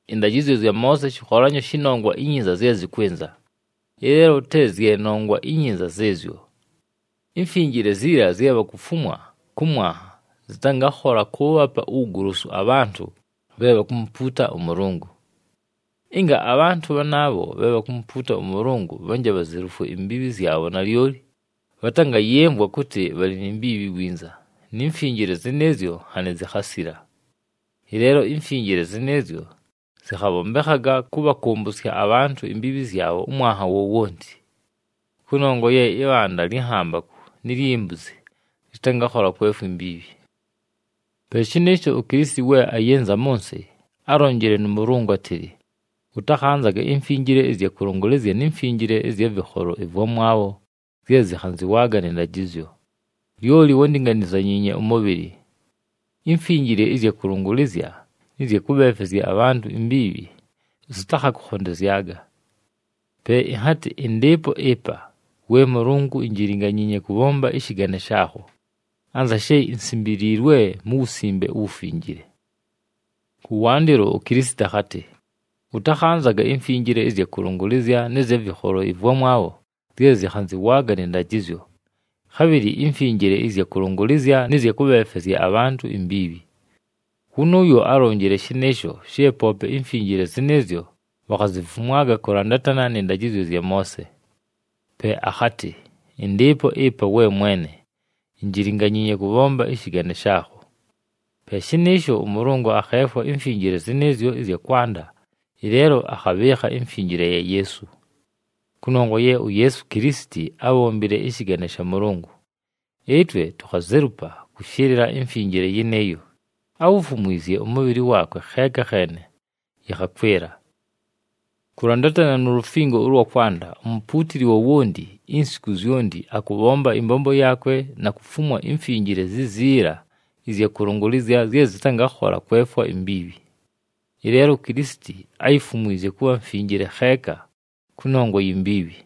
Ɨndajɨzyo zya Moose shɨkholanyo shɨ nongwa inyinza zye zɨkwɨnza, ɨleelo te zye nongwa inyinza zɨɨzyo. Imfinjile ziila zye bhakufumwa kʉ mwanha, zɨtangakhola kʉʉbhapa uwugolosu abhantʉ bhe bhakumupuuta ʉMʉlʉngʉ. Ɨnga abhantʉ bhanaabho bhe bhakumupuuta ʉMʉlʉngʉ bhanje bhazelufwe imbiibhi zyabho nalyoli, bhatangayɨmvwa kʉtɨ bhalɨ ni mbiibhi winza, ni mfinjile zɨnɨɨzyo nhanɨ zikhasila. Ɨleelo imfinjile zɨnɨɨzyo zɨkhabhombekhaga kʉbhakʉmbʉsya abhantʉ imbiibhi zyabho ʉmwanha wowonti. Kʉnongwa ye ɨbhanda lyɨ nhambakʉ ni lyi mbuzi lɨtangakhola kwefwa imbiibhi. Pe shɨnɨɨsho, uKilisiti we ayɨnza mʉ nsɨ, álonjile nʉ Mʉlʉngʉ átɨlɨ, “Ʉtakhanzaga imfinjile ɨzya kʉlʉngʉlɨzya ni mfinjile ɨzya vɨkholo ɨvwamwabho zye zɨkhanzɨwaaga nɨ ndajɨzyo, lyoli wándinganizanyiinye ʉmʉbhɨlɨ. Imfinjile ɨzya kʉlʉngʉlɨzya nɨ zya kʉbhefwezya abhantʉ imbiibhi zɨtakhakʉkhondezyaga. Pe ɨnhatɨ, ‘Ɨndɨɨpo ɨpa, we Mʉlʉngʉ, injilinganyiinye kʉbhomba ɨshɨgane shaakho, anza she insimbiliilwe mu Wusimbe uWufinjile.’” Kʉwandɨlo uKilisiti akhatɨ, “Ʉtakhanzaga imfinjile ɨzya kʉlʉngʉlɨzya nɨ zya vɨkholo ɨvwamwabho zye zɨkhanzɨwaaga nɨ ndajɨzyo, khabhɨlɨ imfinjile ɨzya kʉlʉngʉlɨzya nɨ zya kʉbhefwezya abhantʉ imbiibhi.” Wʉnʉʉyo álonjile shɨnɨɨsho, she poope imfinjile zɨnɨɨzyo bhakhazifumwaga kʉlandatana nɨ ndajɨzyo zya Moose. Pe akhatɨ, “Ɨndɨɨpo ɨpa, we Mwene, injilinganyiinye kʉbhomba ɨshɨgane shaakho.” Pe shɨnɨɨsho, ʉMʉlʉngʉ akheefwa imfinjile zɨnɨɨzyo ɨzya kwanda, ɨleelo akhabhɨɨkha imfinjile ya Yeesu. Kʉnongwa ye uYeesu Kilisiti ábhombile ɨshɨgane sha Mʉlʉngʉ, ɨtwe tukhazelupa kʉshɨlɨla imfinjile yɨnɨɨyo, áwufumwizye ʉmʉbhɨlɨ waakwe kheeka kheene, yɨkhakwɨla. Kʉlandatana nu lufingo ʉlwa kwanda, umupuutili wowonti, insiku zyonti, akʉbhomba ɨmbombo yaakwe na kufumwa imfinjile ziziila ɨzya kʉlʉngʉlɨzya zye zɨtangakhola kwefwa imbiibhi. Ɨleelo uKilisiti áyifumwizye kʉbha mfinjile kheeka kʉnongwa yi mbiibhi,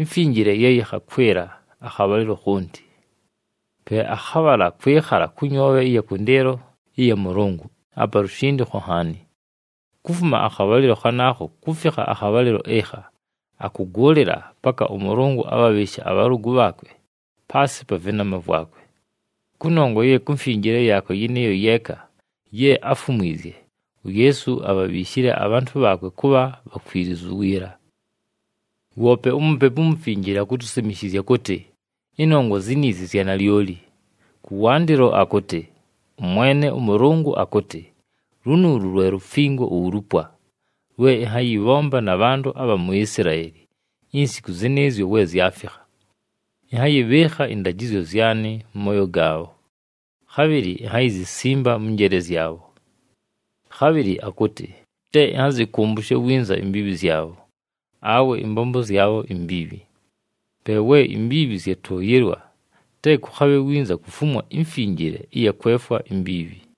imfinjile ye yɨkhakwɨla akhabhalɨlo khonti. Pe akhabhala kwɨkhala kʉ nyoobhe ɨya kʉndɨɨlo ɨya Mʉlʉngʉ, apa lushindikho nhaani. Kufuma akhabhalɨlo khanaakho kufikha akhabhalɨlo ɨkha, akʉgʉʉlɨla paka ʉMʉlʉngʉ abhabhɨɨshe abhalʉgʉ bhaakwe paasɨ pa vɨnama vwakwe. Kʉnongwa ye ku mfinjile yaakwe yɨnɨɨyo yeeka ye áfumwizye, uYeesu abhabhiishile abhantʉ bhaakwe kʉbha bhakwilizu wiila. Woope uMupepu uMufinjile akutusimishizya kʉtɨ ɨnongwa ziniizi zya nalyoli. Kʉwandɨlo akʉtɨ, “ɄMwene ʉMʉlʉngʉ akʉtɨ, ‘Lunuulu lwe lufingo ulupwa, lwe ɨnhayɨbhomba na bhantʉ abha mu Isilaeli insiku zɨnɨɨzyo we zyafikha. Ɨnhayɨbhɨɨkha ɨndajɨzyo zyanɨ mʉ mooyo gaabho, khabhɨlɨ inhayizisimba mʉ njeele zyabho.’” Khabhɨlɨ akʉtɨ, “Te ɨnhazɨkʉmbʉshe winza imbiibhi zyabho, awe ɨmbombo zyabho imbiibhi.” Pe we imbiibhi zyatʉʉyɨlwa, te kʉkhabhe winza kufumwa imfinjile ɨya kwefwa imbiibhi.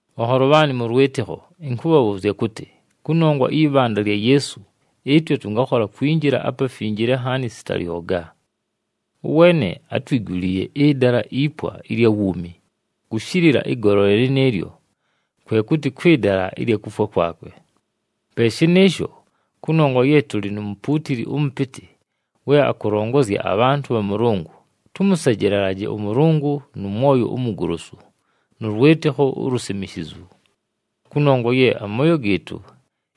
Bhanholo bhaanɨ mʉ lwɨtɨkho, ɨnkʉbhabhʉʉzya kʉtɨ, kʉnongwa ɨyɨ bhanda lya Yeesu, ɨtwe tʉngakhola kwinjila aPafinjile Nhaani sita lyoga. Ʉweene átwiguliiye ɨdala ipwa ɨlya wuumi, kʉshɨlɨla ɨgolole lɨnɨɨlyo, kwe kʉtɨ kwɨ dala ɨlya kufwa kwakwe. Pe shɨnɨɨsho, kʉnongwa ye tʉlɨ nu mupuutili ʉmʉpɨtɨ we akʉlongozya abhantʉ bha Mʉlʉngʉ, tʉmʉsejelelaje ʉMʉlʉngʉ nʉ mwoyo umugolosu nʉ lwɨtɨkho ulusimishizu. Kʉnongwa ye amooyo gɨɨtʉ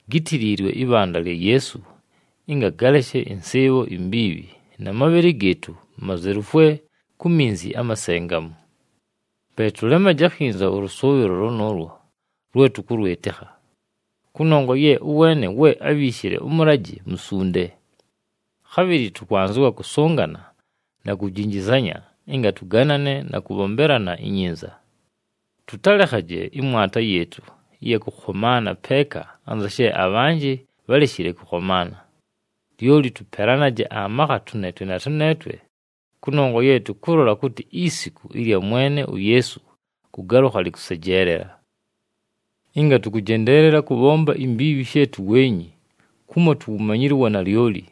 gítiliilwe ɨbhanda lya Yeesu ɨnga galeshe ɨnsɨɨbho imbiibhi, na mabhɨlɨ gɨɨtʉ mazelufwe ku minzi amasengamu. Pe tʉlemaje akhinza ʉlʉsʉʉbhɨlo lʉnʉʉlwo lwe tʉkʉlwɨtɨkha, kʉnongwa ye ʉweene we ábhiishile ʉmʉlajɨ musunde. Khabhɨlɨ tʉkwanzɨwa kʉsʉngana na kujinjizanya ɨnga tʉganane na kʉbhombelana inyinza. Tʉtalekhaje ɨmwata yɨɨtʉ ɨya kʉkhomaana peeka anza she abhanjɨ bhaleshile kʉkhomaana. Lyoli tʉpelanaje amakha tʉneetwe na tʉneetwe kʉnongwa ye tʉkʉlola kʉtɨ isiku ɨlya Mwene uYeesu kʉgalʉkha lɨkʉsejeelela. Ɨnga tʉkʉjendeelela kʉbhomba imbiibhi she tuweenyi, kumo tuwumanyile uwanalyoli,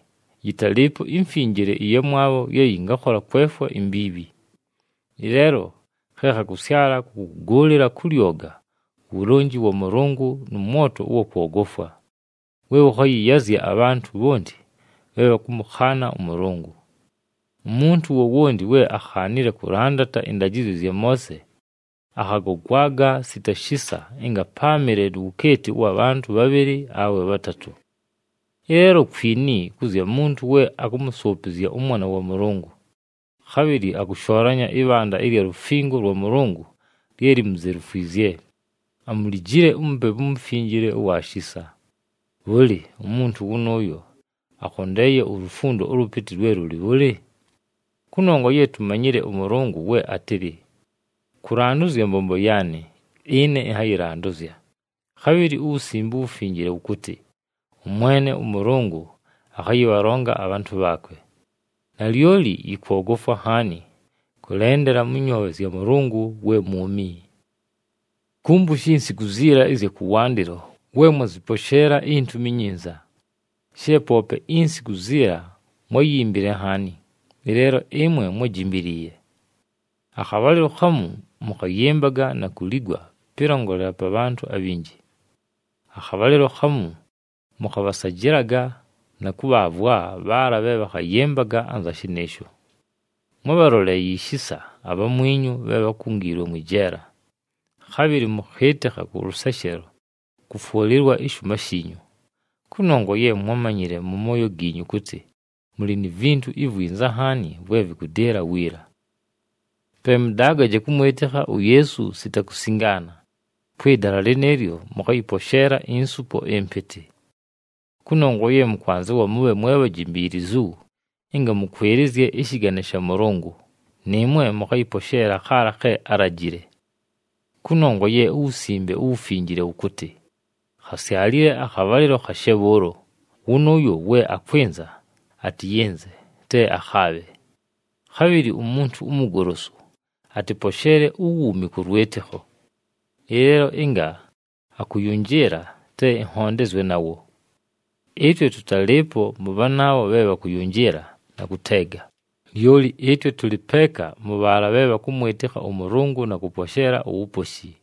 yɨtalɨɨpo imfinjile ɨyamwabho ye yɨngakhola kwefwa imbiibhi. Ɨleelo khe khakʉsyala kʉ kʉgʉʉlɨla kʉ lyoga uwulonji wa Mʉlʉngʉ nʉ mwoto ʉwa kwogofwa we wʉkhayɨyazya abhantʉ bhonti bhe bhakʉmʉkhaana ʉMʉlʉngʉ. Umuntu wowonti we ákhaanile kʉlandata ɨndajɨzyo zya Moose, akhagogwaga sita shisa ɨnga páamɨle nu wukeeti ʉwa bhantʉ bhabhɨlɨ awe bhatatʉ. Ɨleelo kwini kʉ zya muntu we akʉmʉsʉʉpɨzya ʉMwana wa Mʉlʉngʉ, khabhɨlɨ akʉshoolanya ɨbhanda ɨlya lufingo lwa Mʉlʉngʉ lye limuzelufwizye, amulijile uMupepu uMufinjile ʉwa shisa. Bhʉlɨ, umuntu wʉnʉʉyo akhondeeye ulufundo ʉlʉpɨtɨ lwe lʉlɨ bhʉlɨ? Kʉnongwa ye tumanyile ʉMʉlʉngʉ we átɨlɨ, “Kʉlandʉzya mbombo yaanɨ, ɨne ɨnhayɨlandʉzya.” Khabhɨlɨ uWusimbe uWufinjile wʉkʉtɨ, “ɄMwene ʉMʉlʉngʉ akhayɨbhalonga abhantʉ bhaakwe.” Nalyoli yɨkwogofwa nhaani kʉlendela mʉ nyoobhe zya Mʉlʉngʉ we mwumi. Kumbushi insiku ziila ɨzya kʉwandɨlo we mwazɨposheela iNtumi iNyinza. She poope insiku ziila mwáyimbile nhaani, ɨleelo ɨmwe mwájimbiliiye. Akhabhalɨlo khamu mʉkhayɨmbaga na kuligwa pɨlongolela pa bhantʉ abhinji. Akhabhalɨlo khamu mʉkhabhasajɨlaga na kʉbhaavwa bhaala bhe bhakhayɨmbaga anza shɨnɨɨsho. Mwábhaloleeye ishisa abhamwinyu bhe bhákungiilwe mwɨ jeela. Khabhɨlɨ mʉkhɨɨtɨkha kʉ lʉseshelo kʉfwʉlɨlwa ɨshʉʉma shiinyu. Kʉnongwa ye mwámanyile mʉ mooyo giinyu kʉtɨ mʉlɨ ni vintu ivwinza nhaani vwe vɨkʉdɨɨla wiila. Pe mʉdaagaje kʉmwɨtɨkha uYeesu sita kusingaana, kwɨ dala lɨnɨɨlyo mʉkhayɨposheela insupo ɨmpɨtɨ. Kʉnongwa ye mʉkwanzɨwa mʉbhe mwe bhajimbiilizu ɨnga mʉkwɨlɨzye ɨshɨgane sha Mʉlʉngʉ, nɨɨmwe mʉkhayɨposheela khaala khe álajile. Kʉnongwa ye uWusimbe uWufinjile wʉkʉtɨ, “Khasyalile akhabhalɨlo khashe bhʉʉlo, wʉnʉʉyo we akwɨnza atɨyɨnze, te akhaabhe. Khabhɨlɨ umuntu umugolosu atɨposheele uwuumi kʉ lwɨtɨkho. Ɨleelo ɨnga akʉyʉnjɨɨla, te ɨnhondezwe nawo.” Ɨtwe tʉtalɨɨpo mʉ bhanaabho bhe bhakʉyʉnjɨɨla na kʉteega, lyoli ɨtwe tʉlɨ peeka mʉ bhaala bhe bhakʉmwɨtɨkha ʉMʉlʉngʉ na kʉposheela uwuposhi.